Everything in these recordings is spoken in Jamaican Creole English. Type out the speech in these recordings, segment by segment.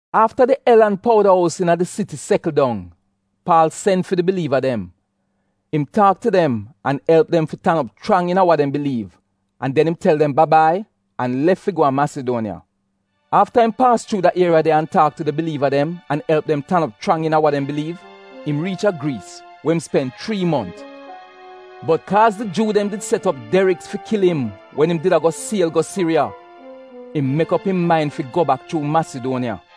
Afta di el an powda ous iina di siti sekl dong, Paal sen fi di biliiva dem. Im taak tu dem an elp dem fi tan op chrang iina wa dem biliiv an den im tel dem ba-bai an lef fi go a Masiduoniya. Afta im paas chuu da ieriya de an taak tu di biliiva dem an elp dem tan op chrang iina wa dem biliiv, im riich a Griis, we im spen chrii mont. Bot kaaz di Juu dem did set op deriks fi kil im wen im did a go siel go Siriya, im mek op im main fi go bak chuu Masiduoniya.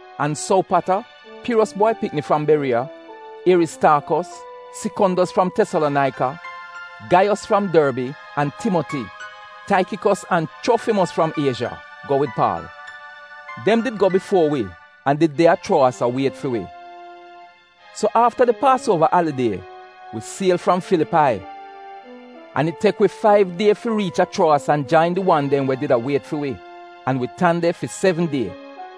An Sowpata, Piros bwai pikni fram Beriya, Ieristaakos, Sikondos fram Tesalonaika, Gaiyos fram Dorbi, an Timoti, Taikikos an Chrofimos fram Iezha go wid Paal. Dem did go bifuo wi an did de a Chuowas a wiet fi wi. So afta di Paasuova alidie, wi siel fram Filipai. An it tek wi faiv die fi riich a Chuowas an jain di wan dem we did a wiet fi wi, an wi tan de fi sevn die.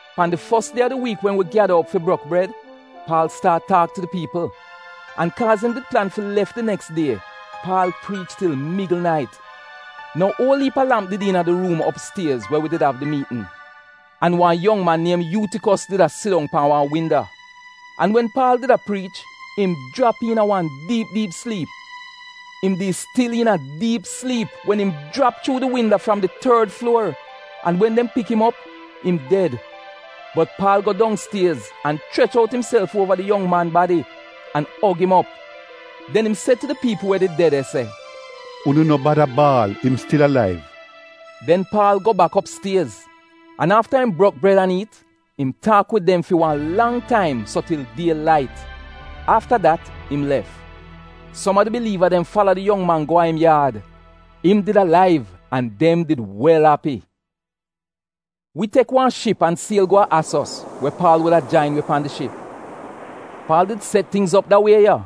Pan di fos die a di wiik wen wi gyada op fi brok bred, Paal staat taak tu di piipl. An kaaz im did plan fi lef di neks die, Paal priich til migl nait. Nou uol iip a lamp did iina di ruum opstiez we wi did av di miitn. An wan yong man niem Yuutikos did a sit dong pan wan winda. An wen Paal did a priich, im jrap iina wan diip diip sliip. Im di stil iina diip sliip wen im jrap chuu di winda fram di tord fluor an wen dem pik im op, im ded. Bot Paal go dongstiez, an chrech out imself uova di yong man badi an og im op. Den im se tu di piipl we did de de se, “Unu no bada baal, im stil alaiv.” Den Paal go bak opstiez, an afta im brok bred an iit, im taak wid dem fi wan lang taim so til die lait. Afta dat im lef. Som a di biliiva dem fala di yong man go a im yaad. Im did alaiv an dem did wel api. Wi tek wan ship an siel go a Asos we Paal wuda jain wi pan di ship. Paal did set tingz op da wie ya,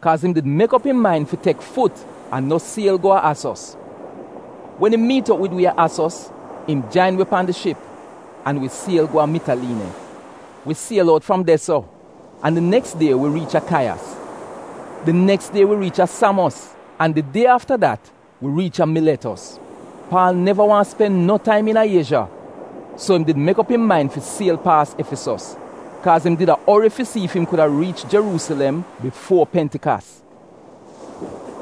kaaz im did mek op im main fi tek fut an no siel go a Asos. Wen im miit op wid wi a Asos, im jain wi pan di ship an wi siel go a Mitaliine. Wi siel out fram de-so an di neks die wi riich a Kaiyas. Di neks die wi riich a Samos an di die afta dat wi riich a Miletos Paal neva waahn spen no taim iina Iezha, so im did mek op im main fi siel paas Efisos, kaaz im did a ori fi si ef im kuda riich Jeruusilem bifuo Pentikas.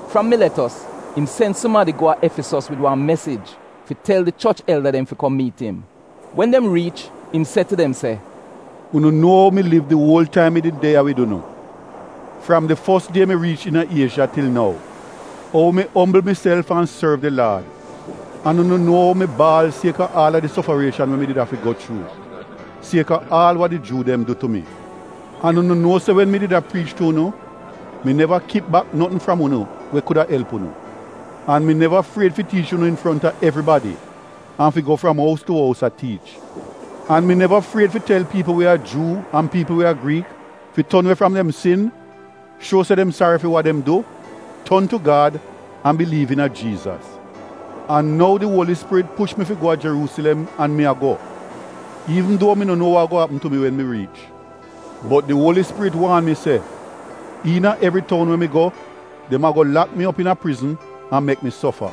Fram Miletos, im sen sumadi go a Efisos wid wan mesij fi tel di choch elda dem fi kom miit im. Wen dem riich im se tu dem se, “Unu nuo ou mi liv di uol taim mi did de ya wid unu, fram di fos die mi riich iina Iezha til nou, ou mi ombl miself an sorv di Laad. An unu nuo ou mi baal kaaz a aal di sofarieshan we mi did afi go chuu sieka aal wa di Juu dem du tu mi. An unu nuo se wen mi did a priich tu unu, mi neva kip bak notn fram unu we kuda elp unu. An mi neva fried fi tiich unu infronta evribadi an fi go fram ous tu ous a tiich. An mi neva fried fi tel piipl we a Juu an piipl we a Griik fi ton we fram dem sin, shuo se dem sari fi wa dem du, ton tu Gad, an biliiv iina Jiizas. An nou di Uoli Spirit push mi fi go a Jeruusilem an mi a go, iivn duo mi no nuo wa ago apm tu mi wen mi riich, bot di Uoli Spirit waan mi se, iina evri toun we mi go, dem ago lak mi op iina prizn an mek mi sofa.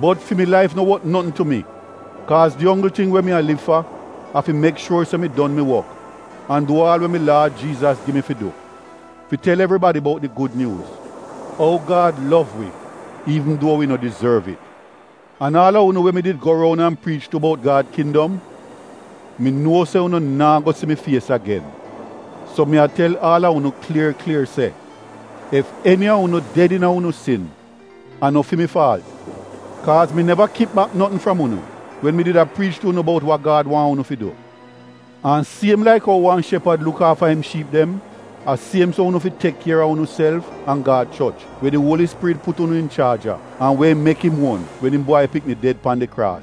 Bot fi mi laif no wot notn tu mi kaaz di onggl ting we mi a liv fa a fi mek shuor se mi don mi wok an du aal we mi Laad Jiizas gi mi fi du, fi tel evribadi bout di Gud Nyuuz — ou Gad gud tu wi, iivn duo wi no dizorv it. “An aal a unu we mi did go roun an priich tu bout Gad kindom, mi nuo se unu naa go si mi fies agen. So mi a tel aal a unu klier klier se ef eni a unu ded iina unu sin, a no fi mi faalt. Kaaz mi neva kip bak notn fram unu wen mi did a priich tu unu bout wa Gad waahn unu fi du. An siem laik ou wan shepad luk aafa im Shiip dem, a siem so unu fi tek kier a unuself an Gad choch we di Uoli Spirit put unu inchaaj a, an we im mek im uon wen im bwai pikni ded pan di kraas.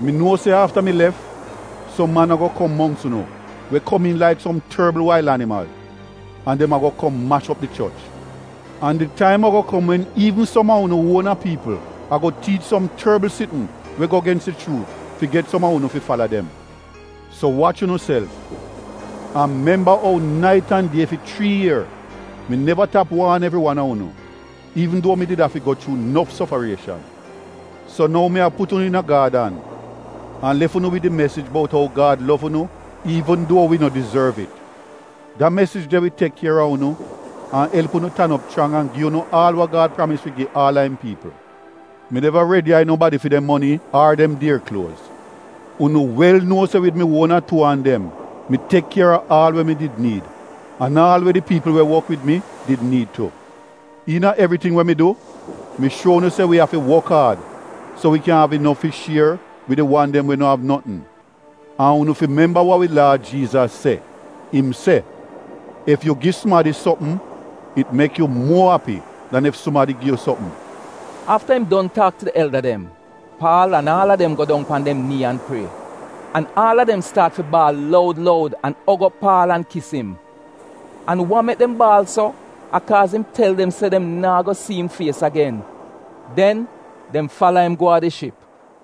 Mi nuo se afta mi lef som man ago kom mongks unu we komiin laik som torbl wail animal an dem ago kom mash op di choch. An di taim ago kom wen iivn som a unu uona piipl ago tiich som torbl sitn we go gens di chuut fi get som a unu fi fala dem. So wach unuself an memba ou nait an die fi chrii ier, mi neva tap waan evri wan a unu, iivn duo mi did afi go chuu nof sofarieshan. “So nou mi a put unu iina Gad an, an lef unu wid di mesij bout ou Gad gud tu unu iivn duo unu no dizorv. Da mesij de wi tek kier a unu an elp unu tan op chrang an gi unu aal wa Gad pramis fi gi aal a im piipl. Mi neva groj nobadi fi de moni ar dem dier kluoz. Unu wel nuo se wid mi uona tuu an dem mi tek kier a aal we mi did niid, an aal we di piipl we wok wid mi did niid tu. Iina evriting we mi du mi shuo unu se wi afi wok aad so wi kyan av inof fi shier wid di wan dem we no av notn. An unu fi memba wa wi Laad Jiizas se, im se, ‘Ef yu gi sumadi sopm, it mek yu muo api dan ef sumadi gi yu sopm.’” Afta im don taak tu di elda dem, Paal an aal a dem go dong pan dem nii an prie. An aal a dem staat fi baal loud loud an og op Paal an kis im. An wa mek dem baal so a kaaz im tel dem se dem naa go si im fies agen. Den dem fala im go a di ship.